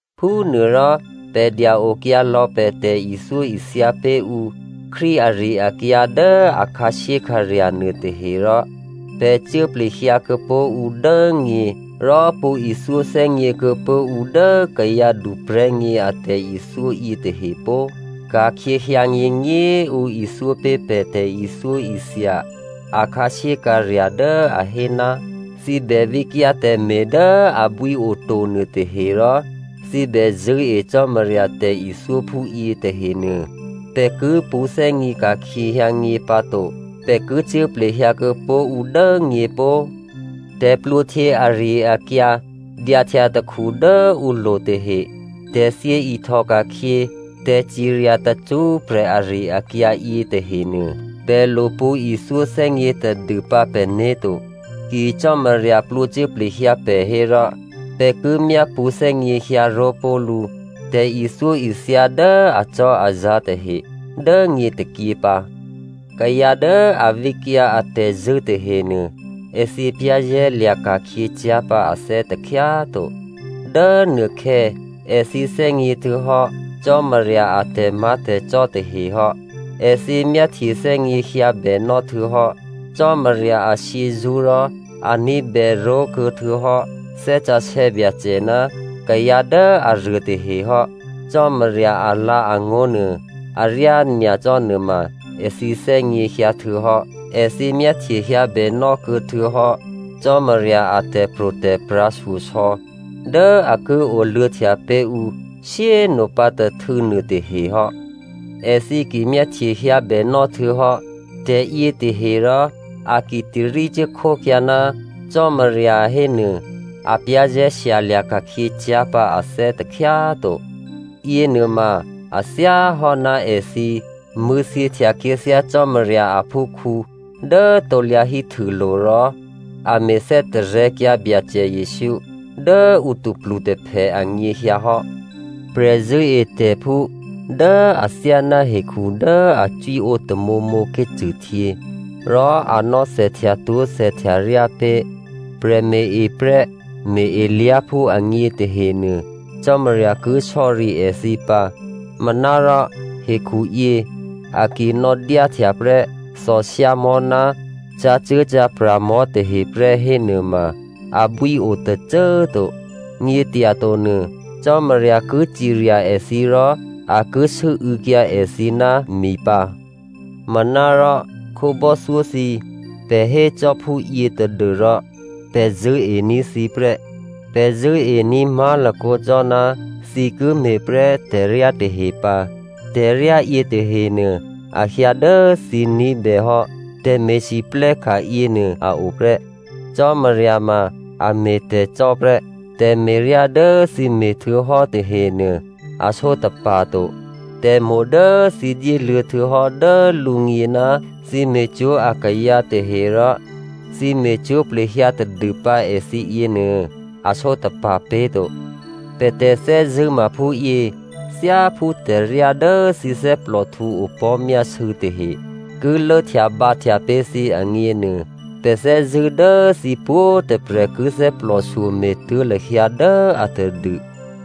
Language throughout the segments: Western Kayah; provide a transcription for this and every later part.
Phúnuôrò pè̤ dya-okyǎ lò̌ pè̤ tè̤ithyóithya pé̤ ǔ Krístu ari-akyǎ dố a khǎshyékhǎrya̤ nuôtahe rò pè̤ cuố plehyǎ kuô̌pó̤ ǔ dố nyě rò pṳ̌ ithyó thè́gně kuô̌pó̤ ǔ dố kayǎ duprè̤́gně a tè̤ithyó yětahe pó꤮. Ka̤khyě hyǎnyěnyě꤮ ǔ ithyó pé̤ pè̤ tè̤ithyóithya a khǎshyékhǎrya̤ dố a hé, thǐ bè vǐkyǎ tè̤me̤ dố abwí oto nuôtahe, rò thǐ bè zṳ̂́e Cò́marya, tè̤ithyó phúyě tahenuô, pè̤ ki pṳ̌thè́gně ka̤khyě hyǎnyě pǎto, pè̤ ki cuố plehyǎ kuô̌pó̤ ǔ dố nyě pó꤮. Tè̤plwǒhtyě ari-akyǎ, dyahtya takhu dố ǔlo̤ tahe, tè̤thyě ihtòka̤khyě, tè̤cirya tacṳ́prè̤ ari-akyǎ yětahenuô, pè̤ lo pṳ̌ ithyó thè́gně tadû pǎ pè̤né̤ to. Ki Cò́marya plwǒcuố plehyǎ pè̤ hérò pè̤ ki myápṳ̌ thè́gněhyǎ ró̤ pó̤ lǔ tè̤ithyóithya dố acò́azǎ̤ tahe dố nyě tôkyě pǎ. Kayǎ dố a vǐkyǎ atè̤zṳ̂́ tahenuô èthǐ za̤ ní̤dû ka̤khyě cyá̤ pǎ ané̤ takhyá꤮ to. Dố nuôkhè̌, èthǐ thè́gně htuô̌hò́ Cò́marya a tè̤má̤tè̤cò́ tahe hò́. Èthǐ myáhtye thè́gněhyǎbènò́ htuô̌hò́ Cò́marya ashyězṳ́ rò a ní̤bèró̤ kuô̌htuô̌hò́ Thè́ Sǎsè̌ Byacè ná kayǎ dố aruôtahe hò́. Cò́marya alǎ̤angó̤ nuô, aryá nyacò́ nuôma èthǐ thè́gněhyǎ htuô̌hò́. Èthǐ myáhtyehyǎbè nò́kuô̌ htuô̌hò́ Cò́marya a tè̤pro̤tè̤prya̤ shyosò̌ dố a ki oluô̌htya pé̤ ǔ shyé꤮ nopǎ tôhtû̌ nuôtahe hò́. Èthǐ ki myáhtyehyǎ bènò́ htuô̌hò́ tè̤yětahe rò a ki tarí cuốkhókyǎ ná Cò́marya hénuô, a za̤ ní̤ ka̤khyě cyá̤ pǎ ané̤ takhyá꤮ to. Yěnuôma a thyáhò́ ná èthǐ mṳ̂̌thyěhtya khyěthyá Cò́marya aphúkhǔ dố krusulo̤ rò a me̤ thè́tarè̤̌kyǎ Byacè Jesǔ dố ǔ tôplutôphè anyěhyǎ hò́. Prè̤zṳ̂́etè̤phú dố athyáná hekhu dố a cwíǒ tamǒmǒ ké̤cṳ̂htyě rò a nò̌thèhtyatwó̤ thèhtyaryá pé̤ prè̤me̤-eprè́ me̤-elyá̤phú agně tahenuô, Cò́marya ki sò̌ri èthǐ pǎ. Manárò hekhuyě a ki nò̌dyáhtya prè́ thòshyámò̤́ ná cǎcuố̤cǎprya̤mò̤́ taheprè́ hénuôma, abwí o tôcô꤮ to. Nyě̤tyato nuô Cò́marya ki cirya èthǐ rò a ki sû́û̌kyǎ èthǐ ná mi pǎ. Manárò khǒbò́thyó thǐ꤮, pè̤ hécò́ phúyě tadû́rò pè̤ zṳ̂́ení̤ thǐ prè́. Pè̤ zṳ̂́ení̤ má̤lakǒ cò́ ná thǐ ki me̤ prè́ tè̤ryá tahe pǎ. Tè̤ryá yětahenuô, a hyǎ dố thǐ ní̤bèhò́ tè̤me̤lwóhteka̤ yěnuô a o prè́. Cò́marya ma a me̤ tè̤cò́ prè́. Tè̤me̤ryá dố thǐ me̤htuô̌hò́ tahenuô a sǒtapa̤ to. Tè̤mo̤ dố thǐ dyéluô̌ htuô̌hò́ dố lǔgně ná thǐ me̤cwó̤ akayǎ tahe rò thǐ me̤cwó̤ plehyǎ tadûpǎ èthǐ yěnuô a sǒtapa̤ pé̤to. Pè̤ tè̤thè́zṳ̂́ ma phúyě: thyáphú tè̤ryá dố thǐ thè́plòhtǔ opò̤́myásû̌ tahe ki lốhtyabǎhtya pé̤ thǐ agněnuô, pè̤ thè́zṳ̂́ dố thǐ pwǒ̤꤮ tôprè̤ ki thè́plòshyo me̤tuố̤ lahyǎ dố atadû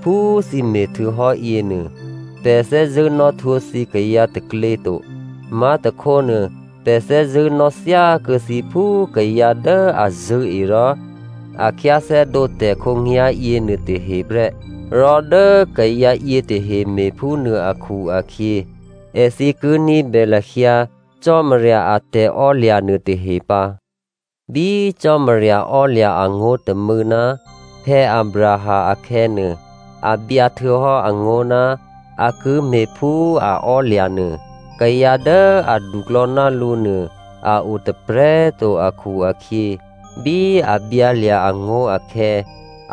phú thǐ me̤htuô̌hò́ yěnuô. Pè̤ thè́zṳ̂́ nò̌htwǒ thǐ kayǎ taklě to. Má̤tôkhónuô pè̤ thè́zṳ̂́ nò̌ thyákuô̌ thǐ phú kayǎ dố a zṳ̂́e rò a khyáthè́dǒ tè̤ khǒnyá̤ yěnuôtahe prè́. Rò dố kayǎ yětahe me̤phúnuô akhu-akhyě, èthǐ ki ní̤bè lahyǎ Cò́marya a tè̤ò́lya̤ nuôtahe pǎ. Bí Cò́marya ò́lya̤ angó̤ tômû̌ ná Abraham akhè̌nuô, a byǎ htuô̌hò́ angó̤ ná a ki me̤ phú a ò́lya̤ nuô. Kayǎ dố aduklò̌ ná lǔ nuô a o tôprè̤꤮ to akhu-akhyě bí a byǎlya̤ angó̤ akhè̌,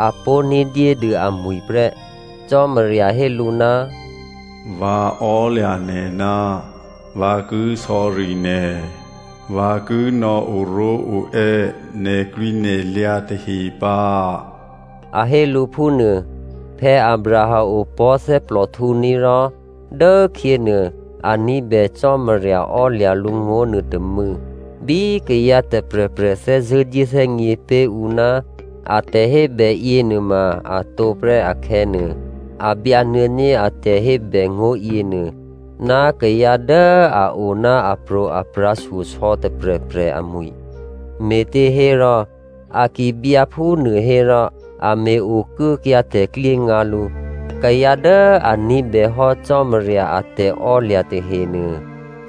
a pó̤ ní̤dyédû amwi̤ prè́. Cò́marya hé lǔ, “Vǎ ò́lya̤ nè̤ ná vǎ ki sò̌ri nè̤, vǎ ki nò̌ oró̤oè́ nè̤klwǐnè̤lyǎ tahe pǎ,” a hé lǔ phúnuô. Abraham opò̤́ thè́plòhtǔní̤, rò dốkhyěnuô a ní̤bè Cò́marya ò́lya̤ lǔngó̤ nuôtômû̌. Bí kayǎ tôprè̤prè̤ thè́zṳ̂́ dyéthè́gně pé̤ ǔ ná a tè̤hébè yěnuôma a tǒprè́ akhè̌nuô, a byǎ nuô̌ní̤ a tè̤hébè ngó̤ yěnuô ná kayǎ dố a o ná apro̤aprya̤ shyosò̌ tôprè̤prè̤ amwi̤. Me̤těhérò, a ki byǎ phúnuô hérò, a me̤ okuốkyǎ tè̤klyéngǎ lǔ. Kayǎ dố a ní̤bèhò́ Cò́marya a tè̤ò́lya̤ tahenuô,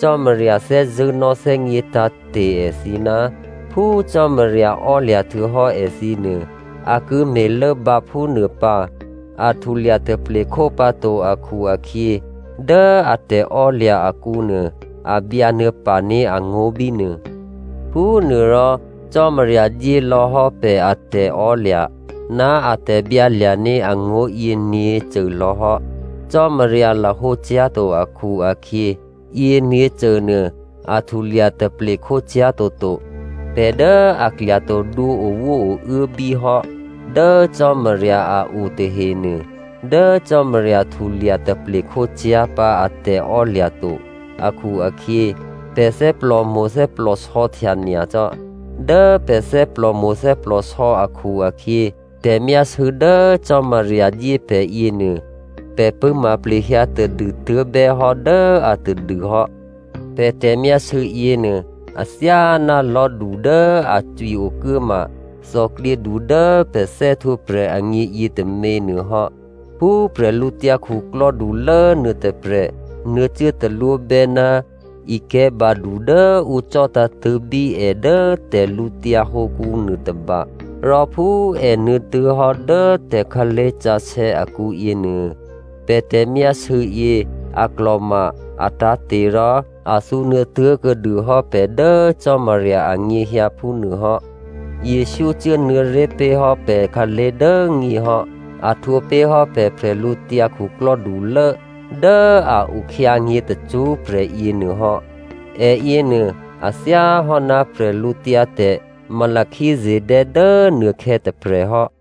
Cò́marya thè́zṳ̂́ nò̌thè́gně tǎ̤te̤ èthǐ ná phú Cò́marya ò́lya̤ htuô̌hò́ èthǐnuô, a ki me̤ lốbǎ phúnuô pǎ, a htulya taplekhó pǎto akhu-akhyě, dố a tè̤ò́lya̤ akǔnuô, a byǎ nuô̌paní̤ angó̤ bínuô. Phúnuôrò Cò́marya dyé lò̌hò́ pè̤ a tè̤ò́lya̤ ná a tè̤byǎlya̤ní̤ angó̤yě nyě̤côlò̌ hò́. Cò́marya lahǒcyá̤to akhu-akhyě, yěnyě̤cô nuô a htulya taple khócyá̤ toto. Pè̤ dố a klya tadwǒ owóouốbí hò́ dố Cò́marya a o tahenuô, dố Cò́marya htulya taple khócyá̤ pǎ a tè̤ò́lya̤ to akhu-akhyě, pè̤ thè́plòmo̤ thè́plòsò̌htya nyacò́. Dố pè̤ thè́plòmo̤ thè́plòsò̌ akhu-akhyě, tè̤myásû̌ dố Cò́marya dyé pè̤yě nuô, pè̤ pṳ̂́ma plehyǎ tadû tuố̤bè́hò́ dố atadû hò́. Pè̤ tè̤myásû̌ yěnuô athyáná lò̤́du dố a cwi okuốma thòklyědu dố pè̤ thè́htwǒprè̤ agně yětômě nuôhò́. Phú bwídukhulố nuôtôprè̤ nuô̌cuố talwóbè́ ná ikè̤̌ badu dố ǔ cò̤́tǎ̤tṳ̂̌bí è dố tè̤lǔtyǎ hǒkǔ nuôtôba, rò phú è nuô̌ tuố̤hò́ dố tè̤khǎlé̤ sǎsè̌ akǔ yěnuô, pè̤ tè̤myásû̌ yě a klò̤ma, a tǎ̤te̤, rò a thǔnuô̌ tuố̤kuô̌dûhò́ pè̤ dố Cò́marya anyěhyǎ phúnuôhò́. Jesǔ cuốnuô̌ré̤ pé̤hò́ pè̤khǎlé̤ dố nyě hò́. A htwǒ pé̤hò́ pè̤ bwídukhulố dố a o khyǎnyě̤ tacṳ́prè̤ yěnuôhò́. È yěnuô a thyáhò́ ná bwídu Melchizedè dố nuôkhè̌ tôprè̤hò́.